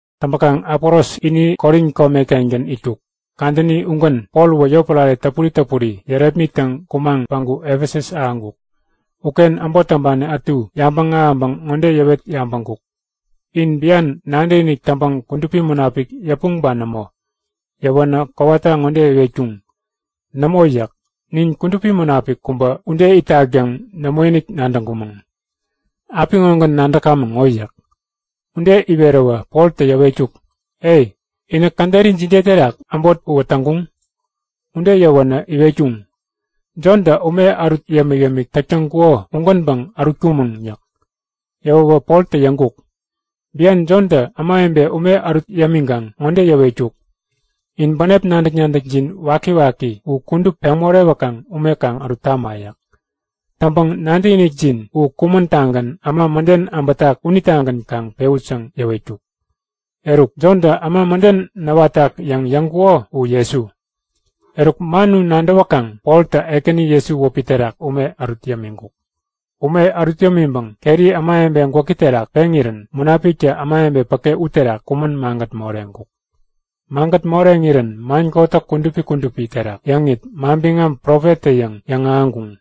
Täŋpäkaŋ Apolos ini Korin kome-kengän itkuk. Kadäni ugän Pol uwä yotpärare täpuri täpuri yärepmittäŋ kumaŋ päŋku Efesus ahäŋkuk. Uken äbot täŋpani ätu yabäŋ ahäŋpäŋ ŋode yäwet yabäŋkuk; In bian nadäkinik täŋpäŋ Kudupi Munapik yäpuŋ ba nämo? Yäwänä kowata ŋode iwetkuŋ; Nämo yäk. Nin Kudupi Munapik kubä ude itak yäŋ nämoinik nadäŋkumäŋ. Apiŋogän nadäkamäŋ ŋo yäk. Ude iweräwä Poltä yäwetkuk; E, inä käderi jide terak äbot uwä täŋkuŋ? Ude yäwänä iwetkuŋ; Jontä ume ärut yämik-yämik täk täŋkuko ugänpäŋ ärutkumäŋ yäk. Yäwäwä Poltä yäŋkuk; Bian Jontä ämawebe ume ärut yämiŋkaŋ ŋode yäwetkuk; In bänep nadäk-nadäkjin wakiwaki u kudup peŋ morewäkaŋ ume kaŋ ärut tama yäk. Täŋpäŋ nadäkinikjin u kumän-tagän äma mäden abätak unitagän kaŋ pewut yäŋ yäwetkuk. Eruk, Jontä äma mäden näwatak yäŋ yäŋkuko uwä Jesu. Eruk, man u nadäwäkaŋ Poltä Ekäni Jesu wäpi terak ume ärut yämiŋkuk. Ume ärut yämiŋpäŋ keri ämawebe gwäki terak peŋirän Munapiktä ämawebe päke uterak kumän magät moreŋkuk. Magät moreŋirän man kotäk kudupi kudupi terak yäŋit, manbiŋam profettä-yäŋ yäŋahäŋkuŋ.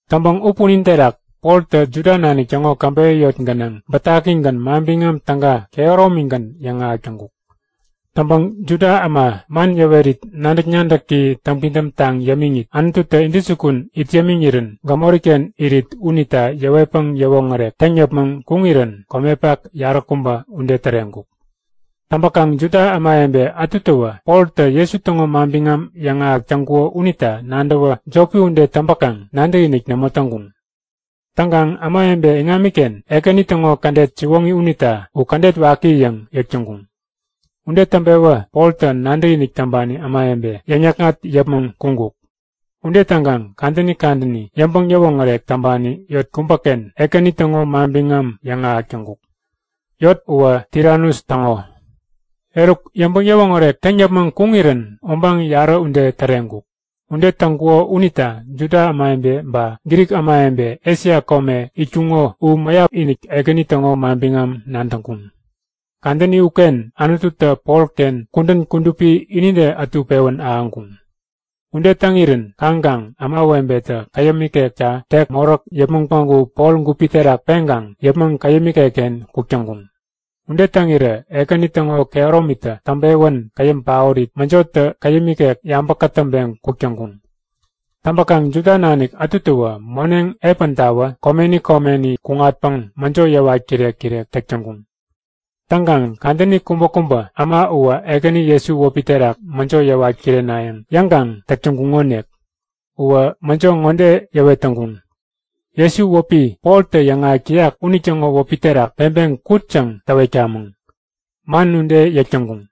Täŋpäŋ u punin terak Poltä Juda nanik täŋo käbeyä yot gänaŋ bätakigän Manbiŋam Täga kehäromigän yäŋahäk täŋkuk. Täŋpäŋ Juda äma man yäwerit nadäk-nadäki täŋpidäm taŋ yämiŋit Anututä intäjukun it yämiŋirän gämoriken irit unita yäwetpäŋ yäwoŋärek täŋ yäpmäŋ kuŋirän komepak yaräkubä ude täreŋkuk. Täŋpäkaŋ Juda ämawebe ätutäwä Poltä Jesu täŋo manbiŋam yäŋahäk täŋkuko unita nadäwä jopi ude täŋpäkaŋ nadäkinik nämo täŋkuŋ. Täŋkaŋ ämawebe iŋamiken Ekäni täŋo kädet siwoŋi unita u kädet waki yäŋ yäk täŋkuŋ. Ude täŋpewä Poltä nadäkinik täŋpani ämawebe yäŋ-yäkŋat yäpmäŋ kuŋkuk. Ude täŋkaŋ kadäni kadäni yäŋpäŋ-yäwoŋärek täŋpani yot kubäken Ekäni täŋo manbiŋam yäŋahäk täŋkuk. Yot uwä Tiranus täŋo. Eruk, yäŋpäŋ-yäwoŋärek täŋ yäpmäŋ kuŋirän obaŋ yarä ude täreŋkuk. Ude täŋkuko unita Juda ämawebe ba Grik ämawebe Esia kome itkuŋo u mäyap-inik Ekäni täŋo manbiŋam nadäŋkuŋ. Kadäni uken Anututä Polken kudän kudupi inide ätu pewän ahäŋkuŋ. Ude täŋirän kaŋkaŋ ämawebetä käyäm ikekta tek moräk yäpmäŋ päŋku Pol gupi terak peŋkaŋ yäpmäŋ käyäm ikekken kuk täŋkuŋ. Ude täŋirä Ekäni täŋo kehäromitä täŋpewän käyäm paorit, mäjotä käyäm ikek yabä kätäŋpeŋ kuk täŋkuŋ. Täŋpäkaŋ Juda nanik ätutäwä moneŋ epäntawä komeni komeni kuŋatpäŋ mäjo yäwat kirek-kirek täk täŋkuŋ. Täŋkaŋ kadäni kubäkubä äma uwä Ekäni Jesu wäpi terak mäjo yäwat kirenayäŋ yäŋkaŋ täk täŋkuŋonik. Uwä mäjo ŋode yäwet täŋkuŋ; Jesu, wäpi Poltä yäŋahäk täyak unitäŋo wäpi terak peŋpeŋ kut yäŋ täwetkamäŋ. Man ude yäk täŋkuŋ.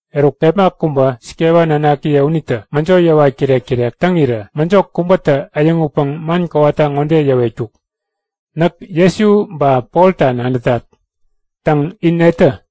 Eruk, kepma kubä Skeva nanakiye unitä mäjo yäwat kirek-kirek täŋirä mäjo kubätä äyäŋutpäŋ man kowata ŋode yäwetkuk; Näk Jesu ba Polta nadätat. Täŋ, in netä?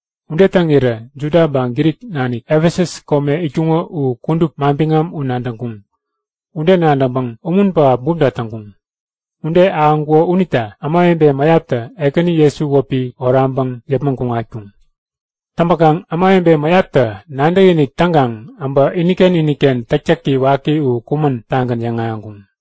Ude täŋirä Juda ba Grik nanik Efesus kome itkuŋo u kudup manbiŋam u nadäŋkuŋ. Ude nadäŋpäŋ umun pähap bumta täŋkuŋ. Ude ahäŋkuko unita ämawebe mäyaptä Ekäni Jesu wäpi oraŋpäŋ yäpmäŋ kuŋatkuŋ. Täŋpäkaŋ ämawebe mäyaptä nadäkinik täŋkaŋ äbä iniken iniken täktäki waki u kumän-tagän yäŋahäŋkuŋ.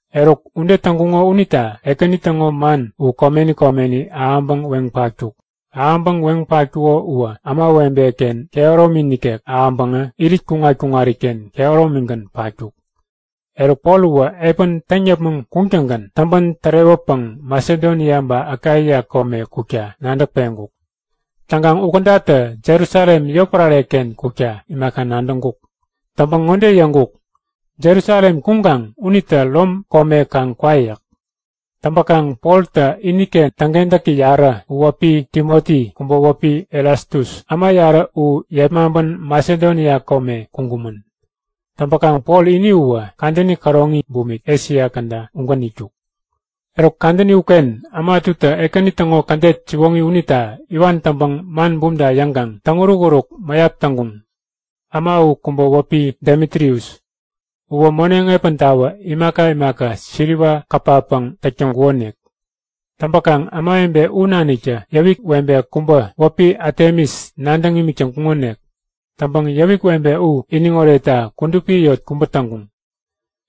Eruk ude täŋkuŋo unita Ekäni täŋo man u komeni komeni ahäŋpäŋ weŋ patkuk. Ahäŋpäŋ weŋ patkuko uwä ämawebe-ken kehäromi nikek ahäŋpäŋä irit-kuŋat-kuŋariken kehäromigän patkuk. Eruk Pol uwä epän täŋ yäpmäŋ kuŋtäŋgän täŋpän tärewäpäŋ Masedonia ba Akaia kome kukta nadäk peŋkuk. Täŋkaŋ u kädatä Jerusalem yotpärare-ken kukta imaka nadäŋkuk. Täŋpäŋ ŋode yäŋkuk; Jerusalem kuŋkaŋ unitä Rom kome kaŋ kwa yäk. Täŋpäkaŋ Poltä iniken täŋkentäki yarä u kubä wäpi Timoti, kubä wäpi Erastus, äma yarä u yepmaŋpän Masedonia kome kuŋkumän. Täŋpäkaŋ Pol ini uwä kadäni käroŋi bumik Esia käda ugän itkuk. Eruk kadäni uken äma ätutä Ekäni täŋo kädet siwoŋi unita iwan täŋpäŋ man bumta yäŋkaŋ täŋuruk-uruk mäyap täŋkuŋ. Äma u kubä wäpi Demitrius. Uwä moneŋ epäntawä imaka imaka siliwa kapapäŋ täk täŋkukonik. Täŋpäkaŋ ämawebe u naniktä yäwik webe kubä wäpi Atemis nadäŋ imik täŋkuŋonik. Täŋpäŋ yäwik webe u iniŋ oretta kudupi yot kubä täŋkuŋ.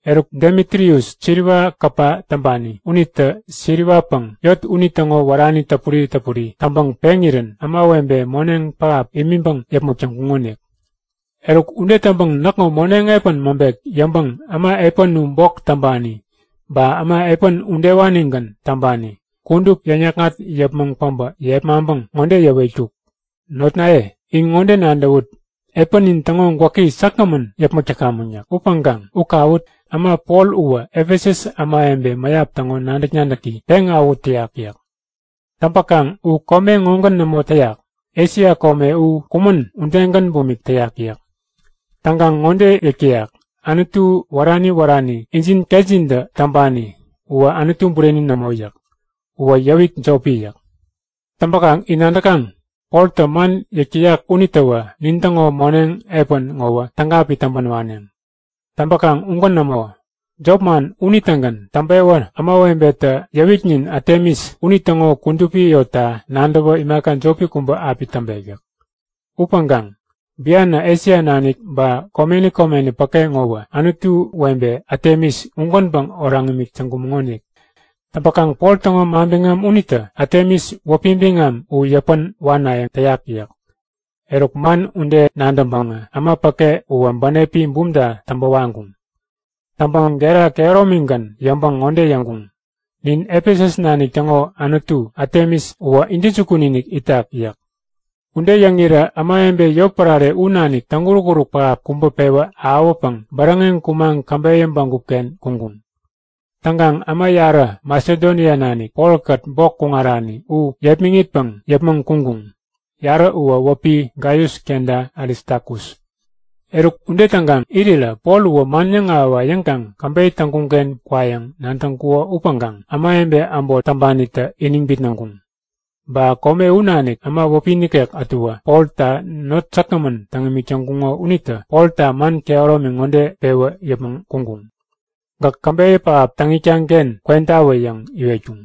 Eruk Demitrius, siliwa kapa täŋpani unitä siriwapäŋ yot unitäŋo wärani täpuri täpuri täŋpäŋ peŋirän ämawebe moneŋ pähap imiŋpäŋ yäpmäk täŋkuŋonik. Eruk ude täŋpäŋ näkŋo moneŋ epän maŋpek yäŋpäŋ äma epän u bok täŋpani ba äma epän udewanigän täŋpani kudup yäŋ-yäkŋat yäpmäŋ päbä yepmaŋpäŋ ŋode yäwetkuk; Notnaye, in ŋode nadäwut. Epänin täŋo gwäki säkgämän yäpmäk täkamäŋ yäk. Upäŋkaŋ u kawut! Äma Pol uwä Efesus ämawebe mäyap täŋo nadäk-nadäki peŋawähut täyak yäk. Täŋpäkaŋ u kome ŋogän nämo täyak. Esia kome u kumän udegän bumik täyak yäk. Täŋkaŋ ŋode yäk täyak; Anutu wärani wärani injin ketjintä täŋpani uwä Anutu bureni nämo yäk. Uwä yäwik jopi yäk. Täŋpäkaŋ in nadäkaŋ; Poltä man yäk täyak unitäwä nintäŋo moneŋ epän ŋowä täga api täŋpän waneŋ. Täŋpäkaŋ ugän nämo. Jop man unitägän täŋpewä ämawebetä yäwiknin Atemis unitäŋo kudupi yotta nadäwä imaka jopi kubä api täŋpek yäk. Upäŋkaŋ bianä Esia nanik ba komeni komeni päke ŋowä anutu webe Atemis ugänpäŋ oraŋ imik täŋkumäŋonik. Täŋpäkaŋ Pol täŋo manbiŋam unitä Atemis wäpi biŋam u yäpän wanayäŋ täyak yäk. Eruk man ude nadäŋpäŋä äma päke uwä bänepi bumta täŋpä waŋkuŋ. Täŋpäŋ gera kehäromigän yäŋpäŋ ŋode yäŋkuŋ; Nin Efesus nanik täŋo anutu Atemis uwä intäjukun-inik itak yäk. Ude yäŋirä ämawebe yotpärare u nanik täŋuruk-uruk pähap kubä pewä ahäwäpäŋ bäräŋeŋ kumaŋ käbeyä bägup-ken kuŋkuŋ. Täŋkaŋ äma yarä Masedonia nanik, Polkät bok kuŋarani u yepmäŋitpäŋ yäpmäŋ kuŋkuŋ. Yarä uwä wäpi Gaius kenta Aristakus. Eruk ude täŋkaŋ irirä Pol uwä man yäŋahäwa yäŋkaŋ käbeyä täŋkuŋ-ken kwayäŋ nadäŋkuko upäŋkaŋ ämawebe äbot täŋpanitä iniŋ bitnäŋkuŋ. Ba kome u nanik äma wäpi nikek ätuwä, Polta not säkgämän täŋ imik täŋkuŋo unitä Polta man kehäromi ŋode pewä yäpmäŋ kuŋkuŋ; Gäk käbeyä pähap täŋ itkaŋ-ken kwentawä yäŋ iwetkuŋ.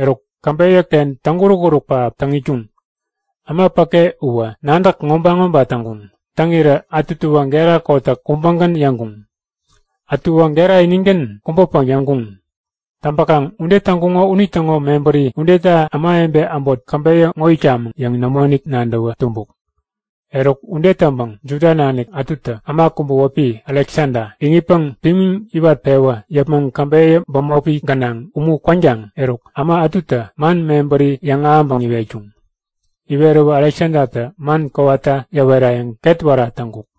Eruk, käbeyä-ken täŋuruk-uruk pähap täŋ itkuŋ. Äma päke uwä nadäk ŋoba-ŋoba täŋkuŋ. Täŋirä ätuwä gera kotäk kubägän yäŋkuŋ. Ätuwä gera inigän kubäpäŋ yäŋkuŋ. Täŋpäkaŋ ude täŋkuŋo unitäŋo mebäri udeta ämawebe äbot käbeyä ŋo itkamäŋ yäŋ nämoinik nadäwä tumbuk. Eruk ude täŋpäŋ Juda nanik ätutä äma kubä wäpi Aleksada iŋitpäŋ pimiŋ iwat-pewä yäpmäŋ käbeyä bämopi gänaŋ umu kwänkaŋ eruk, äma ätutä man mebäri yäŋahäŋpäŋ iwetkuŋ. Iweräwä Aleksadatä man kowata yäwerayäŋ ketwära täŋkuk.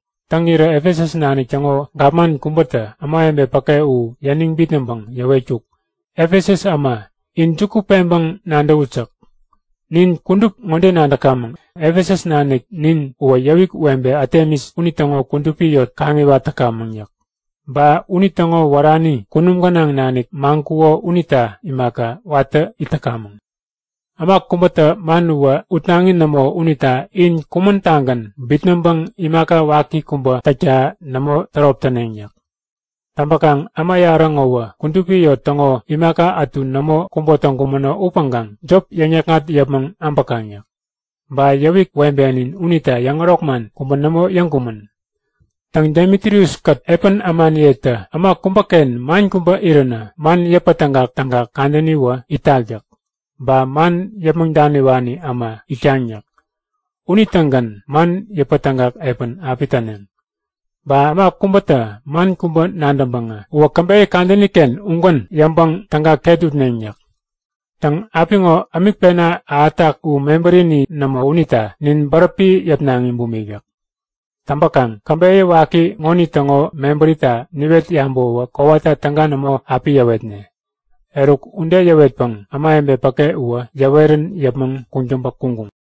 Täŋirä Efesus nanik täŋo gapman kubätä ämawebe päke u yäniŋ bitnäŋpäŋ yäwetkuk; Efesus äma, in juku peŋpäŋ nadäwut yäk. Nin kudup ŋode nadäkamäŋ. Efesus nanik nin uwä yäwik webe Atemis unitäŋo kudupi yot kaŋiwat täkamäŋ yäk. Ba unitäŋo wärani kunum gänaŋ nanik maŋkuko unita imaka, watä it täkamäŋ. Äma kubätä man uwä utnaŋi nämo unita in kumän-tagän bitnäŋpäŋ imaka waki kubä täkta nämo tärop täneŋ yäk. Täŋpäkaŋ äma yarä ŋowä kudupi yot täŋo imaka ätu nämo kubo täŋkumäno upäŋkaŋ jop yäŋ-yäkŋat yäpmäŋ äbäkaŋ yäk. Ba yäwik webenin unita yäŋärok man kubä nämo yäŋkumän. Täŋ, Demitrius-kät epän ämaniyetä äma kubäken man kubä iränä, man yäpätägak-tägak kadäniwä itak yäk. Ba man yäpmäŋ daniwani äma itkaŋ yäk. Unitägän man yäpätägak epän api täneŋ. Ba äma kubätä man kubä nadäŋpäŋä, uwä käbeyä kadäni-ken ugän yäŋpäŋ täga ket utneŋ yäk. Täŋ, apiŋo ämik pena ahätak u mebärini nämo unita nin bäräpi yäpnaŋi bumik yäk. Täŋpäkaŋ käbeyä waki ŋonitäŋo mebärita niwet yabäwäwä kowata täga nämo api yäwetne. Eruk ude yäwetpäŋ ämawebe päke uwä yäwerän yäpmäŋ kuŋtäŋpä kuŋkuŋ.